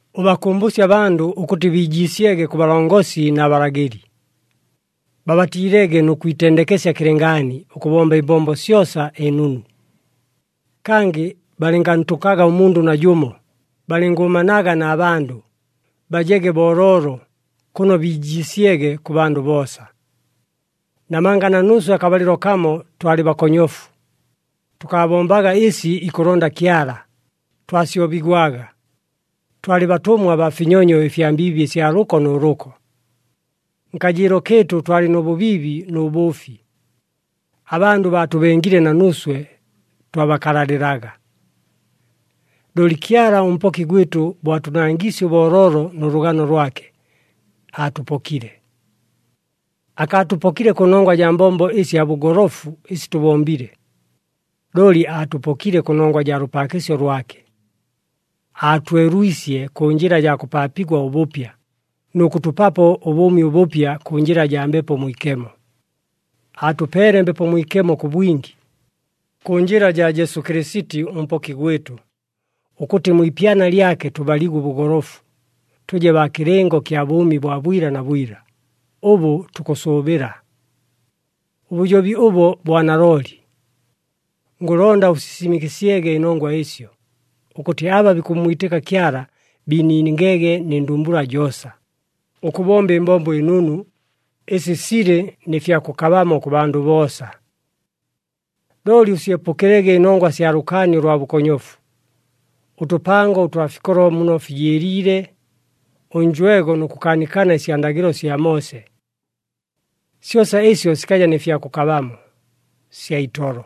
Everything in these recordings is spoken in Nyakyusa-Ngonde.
Ʉbakʉmbʉsye abandʉ ʉkʉtɨ biijiisyege kʉ balongosi na balagɨli. Babatiilege nʉ kwitendekesya kɨlɨngaani ʉkʉbomba ɨmbombo syosa ɨnunu. Kangɨ balɨngantʉkaga ʉmundʉ najʉmo, balɨngʉʉmanaga na bandʉ, bajege booloolo, kʉno biijiisyege kʉ bandʉ boosa. Namanga na nuuswe akabalɨlo kamo twalɨ bakonyofu, tʉkaabombaga ɨsi ikʉlonda Kyala, twasyobigwaga, twalɨ batʉmwa baa finyonyo ɨfya mbiibi ɨsya lʉko nʉ lʉko. Nkajɨɨlo kɨɨtʉ twalɨ nʉ bʉbiibi nʉ bʉʉfi, abandʉ baatʉbengile na nuuswe twabakalalɨlaga. Looli Kyala ʉMpoki gwɨtʉ bo atʉnangiisye ʉbooloolo nʉ lʉgano lwake, aatʉpokile. Akaatʉpokile kʉnongwa jaa mbombo ɨsya bʉgolofu ɨsi tʉbombile, looli aatʉpokile kʉnongwa jaa lʉpaakɨsyo lwake. Aatwelwisye kʉ njɨla jaa kʉpaapigwa ʉbʉpya, nʉ kʉtʉpapo ʉbʉʉmi ʉbʉpya kʉ njɨla jaa Mbepo Mwikemo. Aatʉpeele Mbepo Mwikemo kʉ bwingi, kʉ njɨla jaa Jesu Kɨlɨsiti ʉMpoki gwɨtʉ, ʉkʉtɨ mwi ipyana lyake tʉbaligwe ʉbʉgolofu, tʉje baa kɨlɨngo kya bʉʉmi bwa bwila na bwila, ʉbʉ tukʉsʉʉbɨla. Ʉbʉjobi ʉbo bwa nalooli. Ngʉlonda ʉsisisimɨkɨsyege ɨnongwa ɨsyo, ʉkʉtɨ aba bikʉmmwitɨka Kyala biiningege nɨ ndumbula joosa, ʉkʉbomba ɨmbombo ɨnunu, ɨsi silɨ nɨ fya kʉkabamo kʉ bandʉ boosa. Looli ʉsyepʉkɨlege ɨnongwa sya lʉkaani ʉlwa bʉkonyofu, ʉtʉpango ʉtwa fikolo muno fijɨɨliile, ʉnjwego nʉ kʉkaanikana ɨsya ndagɨlo sya Moose. Syosa ɨsyo sikaja nɨ fya kʉkabamo, sya itolo.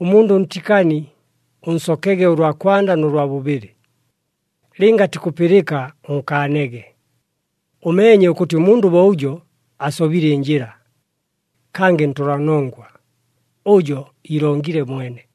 Ʉmundʉ ʉntikani, ʉnsokege ʉlwa kwanda nʉ lwa bʉbɨlɨ, lɨnga atikʉpɨlɨka ʉnkaanege. Ʉmeenye ʉkʉtɨ ʉmundʉ bo ʉjo asobile ɨnjɨla, kangɨ ntʉlanongwa, ʉjo iilongile mwene.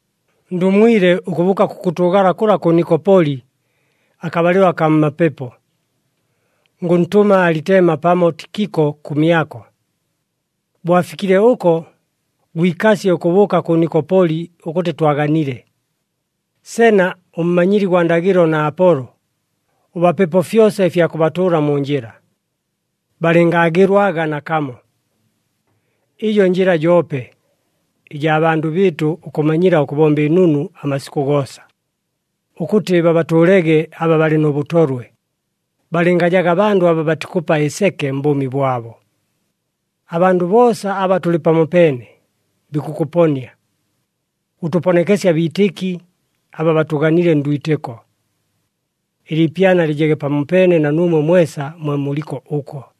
Ndumwile ʉkʉbʉʉka kʉkʉtʉʉgala kʉla kʉ Nikopoli, akabalɨlo akaa mmapepo. Ngʉntʉma Alitema pamo Tikiko kʉmyako. Bo afikile ʉko, gwikasye ʉkʉbʉʉka kʉ Nikopoli ʉkʉtɨ twaganile. Sena ʉmmanyili gwa ndagɨlo na Apolo, ʉbapepo fyosa ɨfya kʉbatʉʉla mu njɨla, balɨngaagɨlwaga nakamo. Ɨjo njɨla joope, ɨjaa bandʉ bɨɨtʉ ʉkʉmanyila ʉkʉbomba ɨnunu amasikʉ goosa, ʉkʉtɨ babatʉʉlege aba balɨ nʉ bʉtolwe, balɨngajaga bandʉ aba batikʉpa ɨseke mbʉʉmi bwabo. Abandʉ boosa aba tʉlɨ pamopeene, bikʉkʉponia. Ʉtʉponekesye abiitɨki, aba batʉganile ndwitɨko. Ɨliipyana lɨjege pamopeene na nuumwe mwesa mwe muliko ʉko.